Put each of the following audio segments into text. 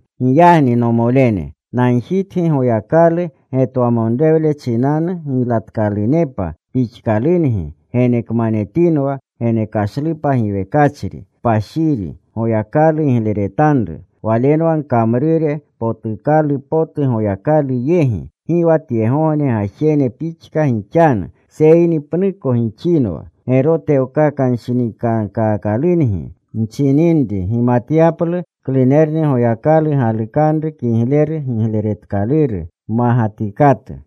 Giyagni, nomolene, nagjitgi Goyakalu getwamonrewle chinanu giylatkalurunepa pixkalungi genekmanetinwa genekashlupa giwekachri, kpashiri, Goyakalu gigleretanru. Walenwa gkamrure potukalu potu Goyakalu yegi. Gi wa tyegogne gajene pixka gixanu, seyni pnuko gixinwa gerotewanshinikankaakalungi nchininri, gimatyaplu klunerni Goyakalu galukanru kigleru gigleretkaluru mmagatikatu.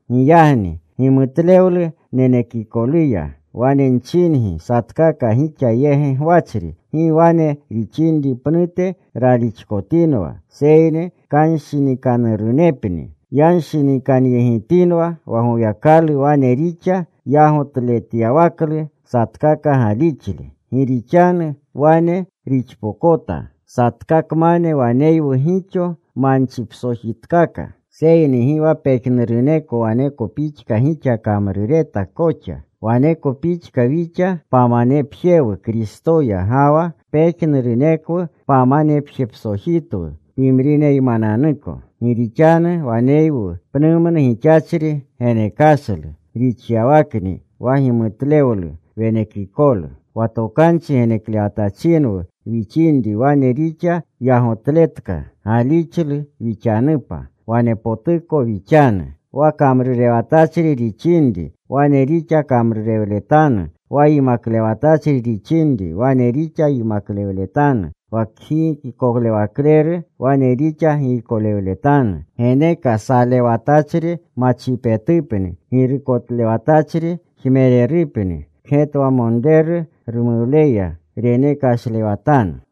Giyagni gimutlewlu nenekikoluya, wane nchingi satkaka gixa yegi gwachri, gi wane rixinri pnute ralixkotinwa, seyni kanshinikanurupni yanshinikanyegitinwa wa Goyakalu wane rixa yagotletyawaklu satkaka galixle. Gi rixanu wane rixpokota. Satkakmane waneywu gixo manchipsojitkaka, seyni gi wa pejnuruneko waneko pixka gixa kamrureta koxa. Waneko pixka wixa pamanepjewu Kristoya, ga wa pejnurunekwu pamanepjepsojitwu pimrineymananuko. Gi rixanu waneywu pnumnu gixachri genekashlu, rixyawakni wa gimutlewlu wenekikolu. Wa tokanchi geneklewatachinwu wixinri wane rixa yagotletka galixlu wixanupa, wanepotuko wixanu. Wa kamrurewatachri rixinri, wane rixa kamrurewletanu. Wa yimaklewatachri rixinri, wane rixa yimaklewletanu. Wa kgiykolewakleru wane rixa giykolewletanu. Geneka salewatachri machipetupni. Girukotlewatachri jmererupni. Kgetwamonreru rumuwleya renekashlewatanu.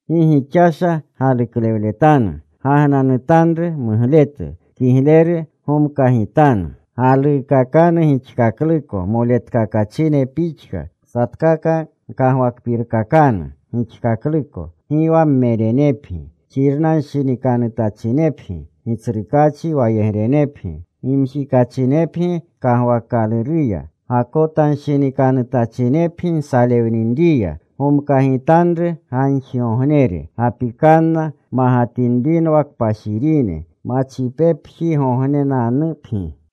Gi gixasha galuklewletanu. Gagnanutanru mugletu. Kigleru gomkagitanu. Galuukakanu gixkakluko moletkakachine pixka. Satkaka gkagwakpirkakanu gixkakluko. Gi wa mmerenepgi. Xirnanshinikanutachinepgi. Gitsrukaachi wayegrenepgi. Gimjikachinepgi kagwaakaluruya. Gakotanshinikanutachinepgi nsalewninriya. Gomkagitanru gagjigognere. Gapikanna magatinrinwa kpashirine. Machipepjingognenanupgi.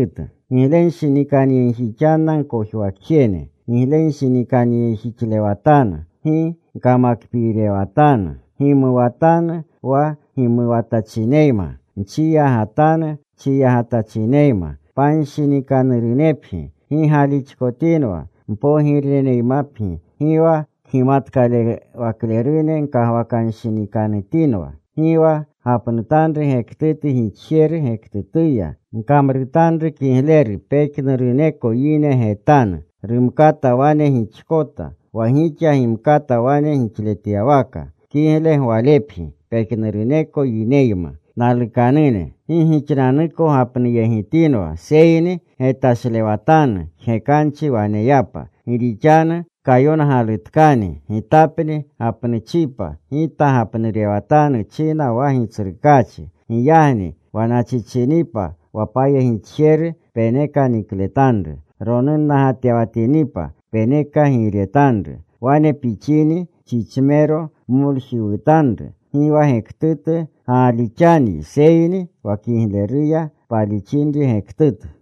Giglenshinikanyegjixanna gkojwakjene. Giglenshinikanyegjixlewatanu. Gi gkamakpiirewatanu. Gimuwatanu wa gimuwatachineyma. Nchiyagatanu chiyagatachineyma. Panshinikanurunepgi. Gi galixkotinwa. Mpogireneymapgi. Gi wa kgimatkalewaklerune gkagwakanshinikanutinwa. Gi wa gapnutanru gektutu gixjeru gektutuya. Gkamrutanru kigleru pejnuruneko yine getanu. Rumkata wane gixkota, wa gixa gimkata wane gixletyawaka, kigle gwalepgi pejnuruneko yineyma. Nalukanune, gi gixananuko gapnuyegitinwa, seyni getashlewatanu jgekanchi waneyapa. Gi rixanu kayongalutkani, Gitanni gapnuuchipa. Gita gapnurewatanu, china wa Gitsrukaachi. Giyagni, wa nachichinipa wa pkamnixjeru peneka nikletanru. Ronunnagatewatinipa peneka giiretanru. Wane pixini chichmero pmoljiwutanru. Gi wa gektutu gaalixanyi seyni wa kigleruya paalixinri gektutu.